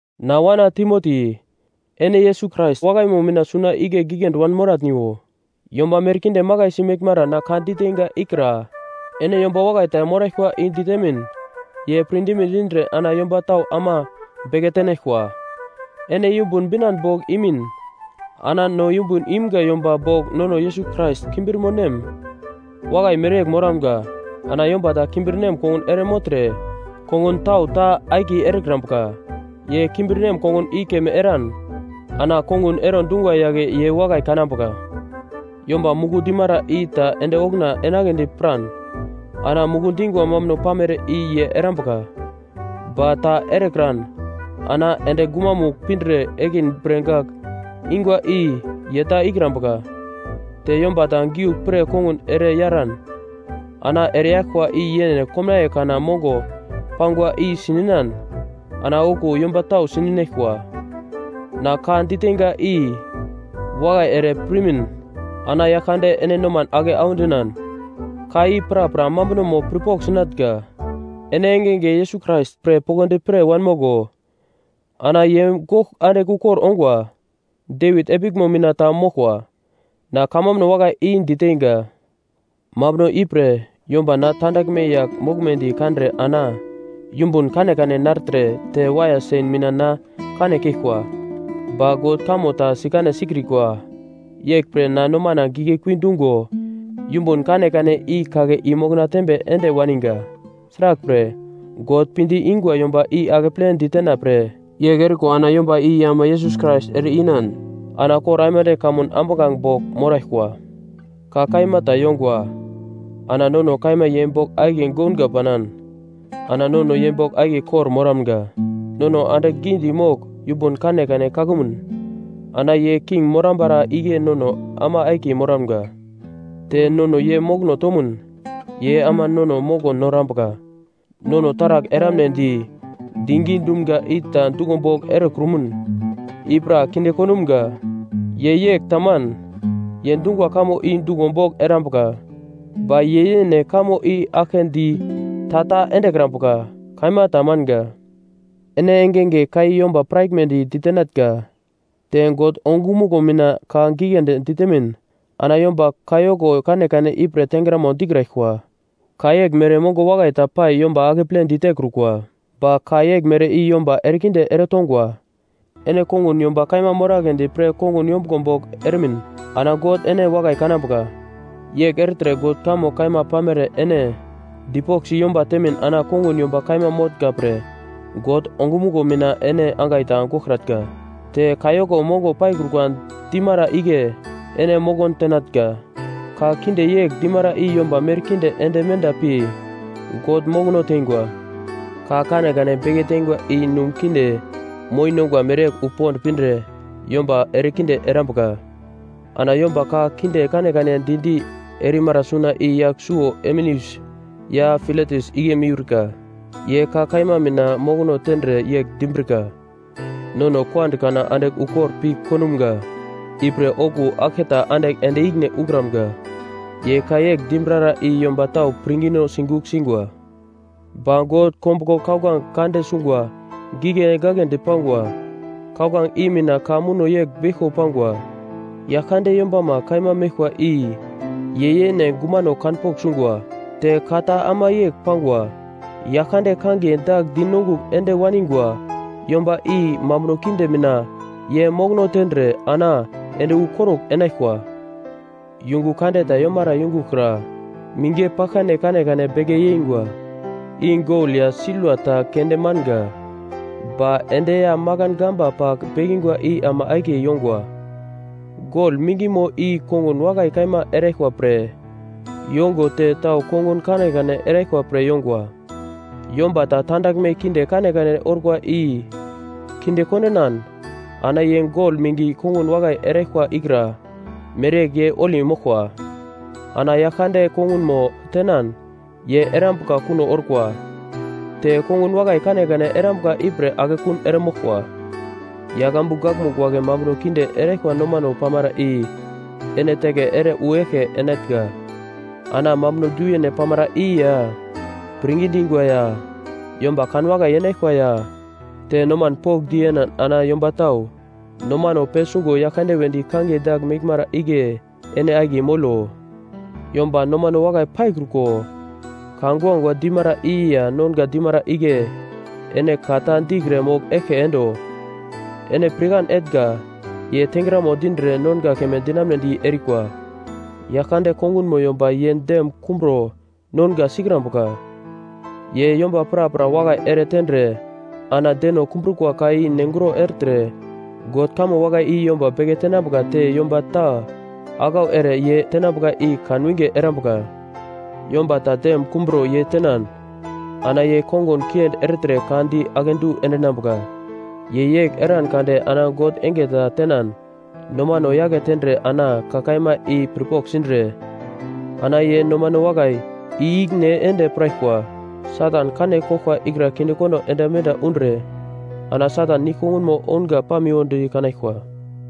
Na wana Timoti, ene Yesus Krais wakaimo mina suna igle giglendi wanmoratniwo. Yomba merkinde makaisi meglmara na ka diteinga ikra ene yomba wakai ta moraglkwa i ditemin ye pirdime dindre ana yomba tau ama beke tenaglkwa. Ene yumbun binan bogl imin ana no yumbun imga yomba bogl nono Yesus Krais kimbirmonem wakai mereyegl moramga. Ana yomba ta kimbirnem kongun ere mogltre, kongun tau ta akiye erekrambuka. Ye kimbirnem kongun i keme eran ana kongun ero dungwa yagle ye wakai kanambuka. Yomba muku dimara i ta ende okuna enagledi piran ana muku dingwa mambuno pamere i ye erambuka. Ba ta erekran ana ende gumamugl pindre ekin bre gagl ingwa i ye ta ikrambuka. Te yomba ta giuglpre kongun ere yaran ana ereyaglkwa i yene komnaiye kana mongo pangwa i sininan ana okuwo yomba tau sininaglkwa. Na ka diteinga i wakai ere pirmin ana Yaglkande ene noman ake audinan, ka i prapra mambunomo pirpogl sinatnga. Ene engenge Yesus Krais pre poglodi pir wanmoglo. Ana ye gogl andigl ukor ongwa. Devit epiglmo mina ta moglkwa. Na kamambuno wakai i diteinga, mambuno ipre yomba na tandaglme yagl moglmedi kandre ana yumbun kanekane nartre, te waiya sen mina na kane keglkwa, ba God kamo ta sikane sikrikwa. Yeglpre na nomana giglekui dungo yumbun kanekane i-kake i-mokona tembe ende waniga. Sraglpre God pinde ingwa yomba i akeple ditena pre yegl eriko ana yomba i ama Yesus Krais ere-inan ana kor aimande kamun ambuglange bogl moraglkwa. Ka kaima ta yongwa: Ana nono kaima ye bogl akiye gounga panan, ana nono ye bogl akiye kor-moramga. Nono andigl gidi mogl yumbun kanekane kakumun, ana ye king morambara igle nono ama akiye moramga. Te nono ye mokono tomun, ye ama nono moko norambuka. Nono taragl eramnedi digi dumga i ta duglo bogl erekrumun, i pra kinde kondumga. Ye yegl taman. Ye dungwa kamo i duglo bogl erambuka. Ba ye yene kamo i aglke di ta-ta endekrambuka. Kaima ta manga. Ene engenge ka i yomba piraglmedi ditenatnga. Te God ongumuglo mina ka giglendi ditemin ana yomba kayoko kanekane ipre tengramo dikraglkwa. Ka yeglmere mongo wakai ta pai yomba akeple ditekrukwa, ba ka yeglmere i yomba erekinde eretongwa. Ene kongun yomba kaima moragledi pre kongun yombuglo bogl eremin ana God ene wakai kanambuka. Yegl ertre God kamo kaima pamere ene dipoglsi yomba temin ana kongun yomba kaima motnga pre God ongumuglo mina ene angai ta goglkratnga. Te kayoko mongo paikrukwa dimara igle ene mokon tenatnga. Ka kinde yegl dimara i yomba merkinde ende menda pi God mokono tengwa. Ka kanekane beke tengwa i num kinde moi nongwa mereyegl wu pond pindre yomba erekinde erambuka. Ana yomba ka kinde kanekane di-di erimara suna i yagl suwo Himeneus ya Filetus igle miurka. Ye ka kaima mina mokono tendre yegl dimbrika, “Nono kuand kana andigl ukor pi kondumga, ipre okuwo aglketa andigl ende ikine ukramga.” Ye ka yegl dimbrara i yomba tau pirngino sigugl singwa. Ba God kombuglo kauglange kande sungwa gigle gaglendi pangwa. Kauglange i mina ka muno yegl beglko pangwa: “Yaglkande yombama kaima meglkwa i ye yene gumano kanpogl sungwa.” Te ka ta ama yegl pangwa: “Yaglkande kangiye dagl dinongugl ende waningwa yomba i mambuno kinde mina ye mokono tendre ana ende wu korugl enaglkwa.” Yungu kande ta yomara yungugl kra mingi paglkane kanekane beke yeingwa, i gol ya silva ta keunde manga, ba endi ya makan gamba pagl bekingwa i ama akiye yongwa. Gol mingimo i kongun wakai kaima eraglkwa pre yongo te tau kongun kanekane eraglkwa pre yongwa. Yomba ta tandaglme kinde kanekane orkwa i kinde kondinan, ana ye gol mingi kongun wakai eraglkwa ikra mereyegl ye holi moglkwa. Ana Yaglkande kongunmo tenan ye erambuka kuno orkwa, te kongun wakai kanekane erambuka ipre akekun eremoglkwa. Yagl ambu gakmugl wagle mambuno kinde eraglkwa nomano pamara i ene teke ere wu eglke enatnga. Ana mambuno du-yene pamara i ya, pirngi dingwa ya yomba kanwakai yenaglkwa ya te noman pokndi yenan ana yomba tau nomano pesungo Yaglkande wedi kangiye dagl meglmara igle ene akiye molo. Yomba nomano wakai paikruko ka guagua dimara i ya nonga dimara igle ene ka ta dikre mogl eglke endo. Ene pirkan etnga ye tengramo dindre nonga keme dinamunedi erikwa. Yaglkande kongunmo yomba ye dem kumburo nonga sikrambuka. Ye yomba prapra wakai ere tendre ana deno kumbrukwa ka i nenguro ertre God kamo wakai i yomba beke tenambuka te yomba ta aglau ere ye tenambuka i kan winge erambuka. Yomba ta dem kumbro ye tenan ana ye kongun kiendi ertre ka di akedu endinambuka. Ye yegl eran kade ana God enge ta tenan nomano yake tendre ana ka kaima i pirpogl sindre, ana ye nomano wakai i-ikine ende piraglkwa, Satan kane koglkwa ikra kindekondo ende menda undre ana Satan nigl kongunmo ounga pamiwodi kanaglkwa.